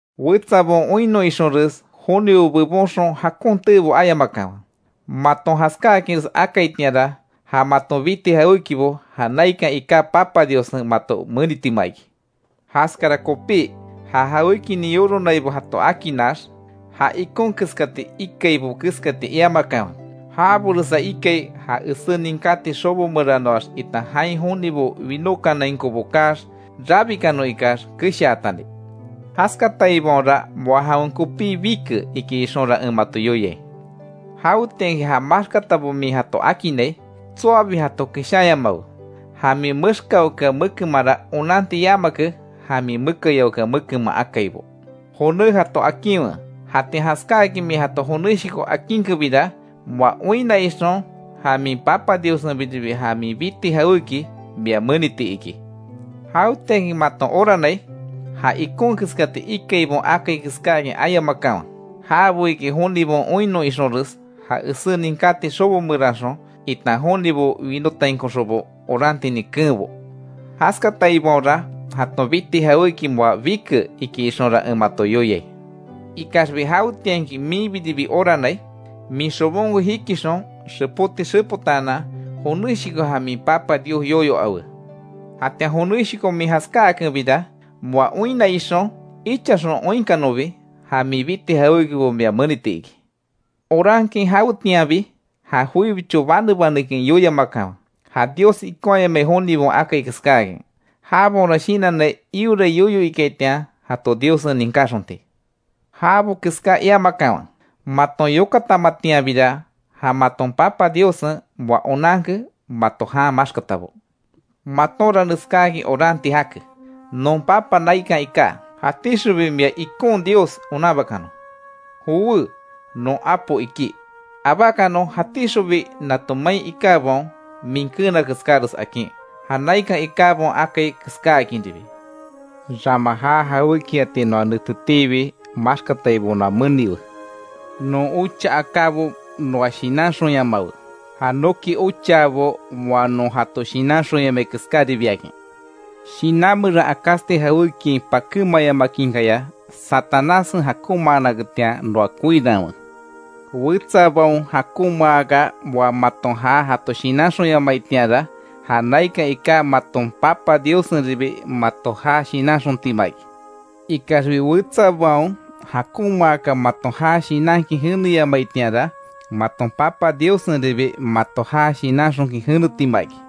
Wetsabaon oinnon ixonres jonibo bebonxon jakon teebo ayamakanwe. Maton jaskáakinres akaitianra, ja maton biti jawékibo, ja naikan iká Papa Diossen, mato menitima iki. Jaskara kopí, ja jawékinin yoronaibo jato akinax, ja ikon keskati ikaibo keskati iamakanwe. Jaboresa ikai, ja esé ninkáti xobo meranoax itan jain jonibo winotainkobo kaax, rabikanon ikax keshaatani. Jaskataibaonra moa jawen kopí bike iki ixonra en mato yoiai. Jawetianki ja maxkatabo min jato akinnai, tsoabi jato keshanyamawe, ja min mexkaokea mekemanra onanti yamake, ja min mekayaokea mekenman akaibo. Joné jato akinwe. Jatian jaskáakin min jato jonéshoko akinkenbira, moa oinna ixon, ja min Papa Diossenbiribi ja min biti jawéki mia meniti iki. Jawetianki maton oranai, ja ikon keskati ikaibaon akai keskáakin ayamakanwe. Jabo iki jonibaon oinnon ixonres ja esé ninkáti xobo meranxon itan jonibo winotainkoxonbo orantinin keenbo. Jaskataibaonra jaton biti jawéki moa bike, iki ixonra en mato yoiai. Ikaxbi jawetianki minbiribi oranai, min xobonko jikixon, xepóti xepotaanan, joneshoko ja min Papa Dios yoyo awe. Jatian joneshoko min jaskáakenbira, moa oinna ixon, ichaxon oinkanonbi, ja min biti jawékibo mia meniti iki. Orankin, jawetianbi ja joibicho bane banekin yoiamakanwe; ja Dios ikonhayamai jonibaon akai keskáakin. Jabaonra shinannai iorai yoyo ikaitian jato Diossen ninkáxonti. Jabo keská iamakanwe. Maton yokatamatianbira, ja maton Papa Diossen moa onanke mato jan maxkatabo. Matonra neskáakin oranti jake: ‘Non Papa naikan iká, jatíxonbi mia ikon Dios onanbakanon. Jowé, non apo iki, abákanon jatíxonbi nato main ikábaon min keena keskáres akin, ja naikan ikábaon akai keskáakinribi. Rama ja jawékiati noa netetiibi maxkataibo noa meniwe. Non ocha akábo noa shinanxonyamawe, ja noki ochaabo moa non jato shinanxonyamai keskáribiakin. Shinan meran akásti jawékiain pakémayamakinkaya, Satanássen jakonmaanaketian noa koiranwe’. Wetsabaon jakonmaaka, moa maton ja jato shinanxonyamaitianra, ja naikan iká maton Papa Diossenribi mato ja shinanxontima iki. Ikaxbi wetsabaon jakonmaaka, maton ja shinankin jeneyamaitianra, maton Papa Diossenribi mato ja shinanxonkin jenetima iki.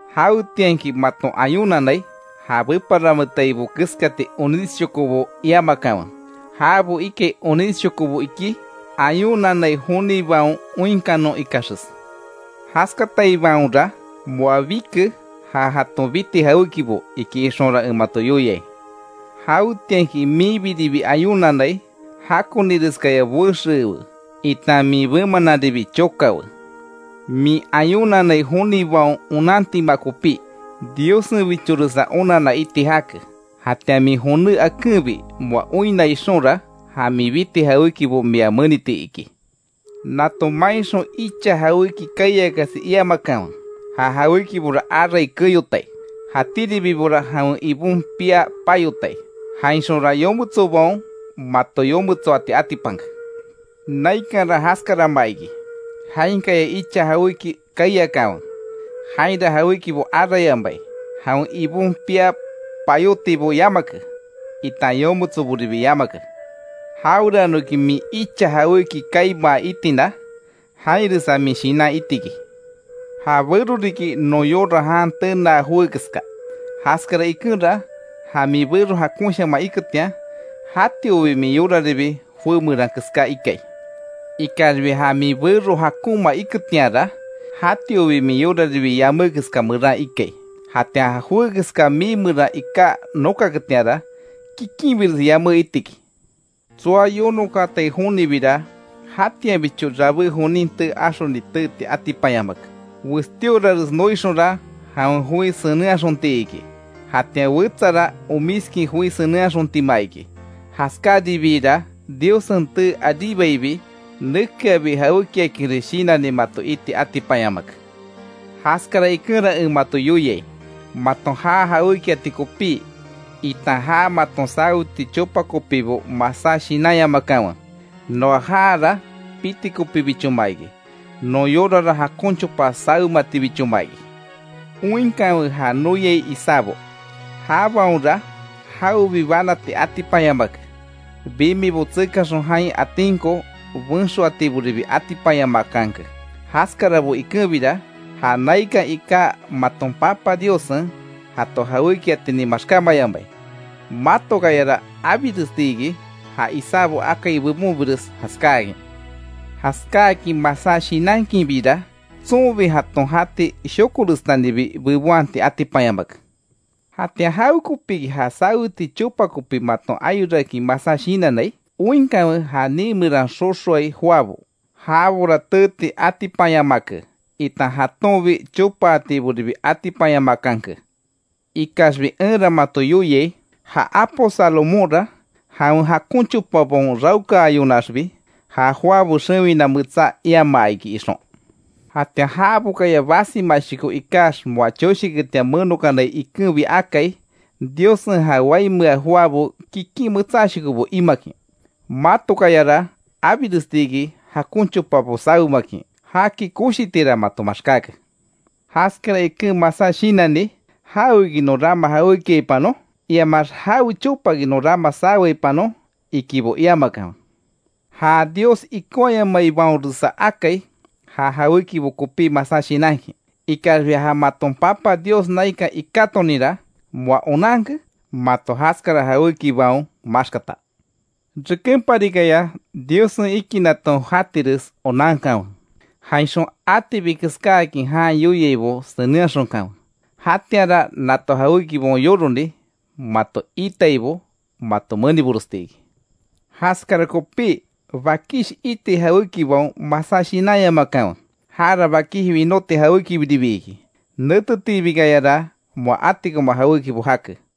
Jawetianki maton ayunanai, ja beparametaibo keskati onísshokobo iamakanwe. Jabo ikai onisshokobo iki, ayunanai jonibaon oinkanon ikaxes. Jaskataibaonra moa bike ja jaton biti jawékibo, iki ixonra en mato yoiai. Jawetianki minbiribi ayunanai, jakonireskaya boexeewe, itan min bemananribi chokawe. Min ayunanai jonibaon onantima kopí. Diossenbichoresa onanna iti jake. Jatian min joné akenbi moa oinna ixonra, ja min biti jawékibo mia meniti iki. Nato mainxon icha jawéki kaiakasi iamakanwe. Ja jawékibora arai keyotai, jatíribibora jawen ibon pia payotai, jainxonra yometsobaon mato yometsoati atipanke. Naikanra jaskarama iki, jainkaya icha jawéki kaiakanwe, jainra jawékibo arayamai, jawen ibon pia payótibo yamake, itan yometsoboribi yamake. Jaweranoki min icha jawéki kaimaa itina, jainresa min shinan itiki. Ja bero riki non yora jan tenaa joé keska; jaskara ikenra, ja min bero jakonshaman iketian, jatiobi min yoraribi joé meran keská ikai. Ikaxbi ja min bero jakonma iketianra, jatiobi min yoraribi yamé keska meran ikai. Jatian ja joé keska mii meran iká nokaketianra, kikinbires yamé itiki. Tsoa yonokaatai jonibira, jatianbicho rabé jonin tee axoni teeti atipanyamake. Westíorares noixonra, jawen joi senenhaxonti iki. Jatian wetsara, omiskin joi senenhaxontima iki. Jaskáribiira, Diossen tee aríbaibi, nekeabi jawékiakinres shinanni mato iti atipanyamake. Jaskara ikenra en mato yoiai: Maton ja jawékiati kopí, itan ja maton saweti chopa kopibo, masá shinanyamakanwe. Noa jaara piti kopíbichoma iki, non yorara jakon chopa sawematibichoma iki. Oinkanwe ja noyai isábo; jabaonra jawebi banati atipanyamake; bimibo tsekaxon jain atinko benxoatiboribi atipanyamakanke. Jaskarabo ikenbira, ja naikan iká maton Papa Diossen, jato jawékiatinin maxkámayamai. Matokayara abiresti iki, ja isábo akai bebonbires jaskáakin. Jaskáakin masá shinankinbira, tsonbi jaton jati shokorestanibi bebonhati atipanyamake. ¿Jatian jawekopíki, ja saweti chopa kopi maton ayorakin masá shinannai? Oinkanwe, ja nii meran xoxoai joabo. Jabora teeti atipanyamake, itan jatonbi chopaatiboribi atipanyamakanke. Ikaxbi, enra mato yoiai: Ja apo Salomónra jawen jakon chopabaon raokaayonaxbi ja joabo xewina metsá iamaa iki ixon. Jatian jabokaya basimashoko ikax, moa choshiketian menokanai ikenbi akai Diossen ja waimea joabo kikin metsáshokobo imakin. Matokayara abiresti iki jakon chopabo sawemakin. ¡Jaki koshitira mato maxkáke! Jaskara iken masá shinanni: ‘¿Jaweki non rama jawékiaipanon?’ iamax ‘¿Jawe chopaki non rama saweaipanon?’ ikibo iamakanwe. Ja Dios ikonhayamaibaonresa akai ja jawékibo kopí masá shinankin. Ikaxbi ja maton Papa Dios naikan ikátoninra, moa onanke mato jaskara jawékibaon maxkata. Rekenparikaya Diossen ikinaton jatires onankanwe, jainxon atibi keskáakin jan yoiaibo senenhaxonkanwe. Jatianra nato jawékibaon yoroni mato iitaibo mato meniboresti iki. Jaskara kopí bakish iti jawékibaon masá shinanyamakanwe, jara bakish winóti jawékibiribi iki. Netetiibikayara moa atikoma jawékibo jake.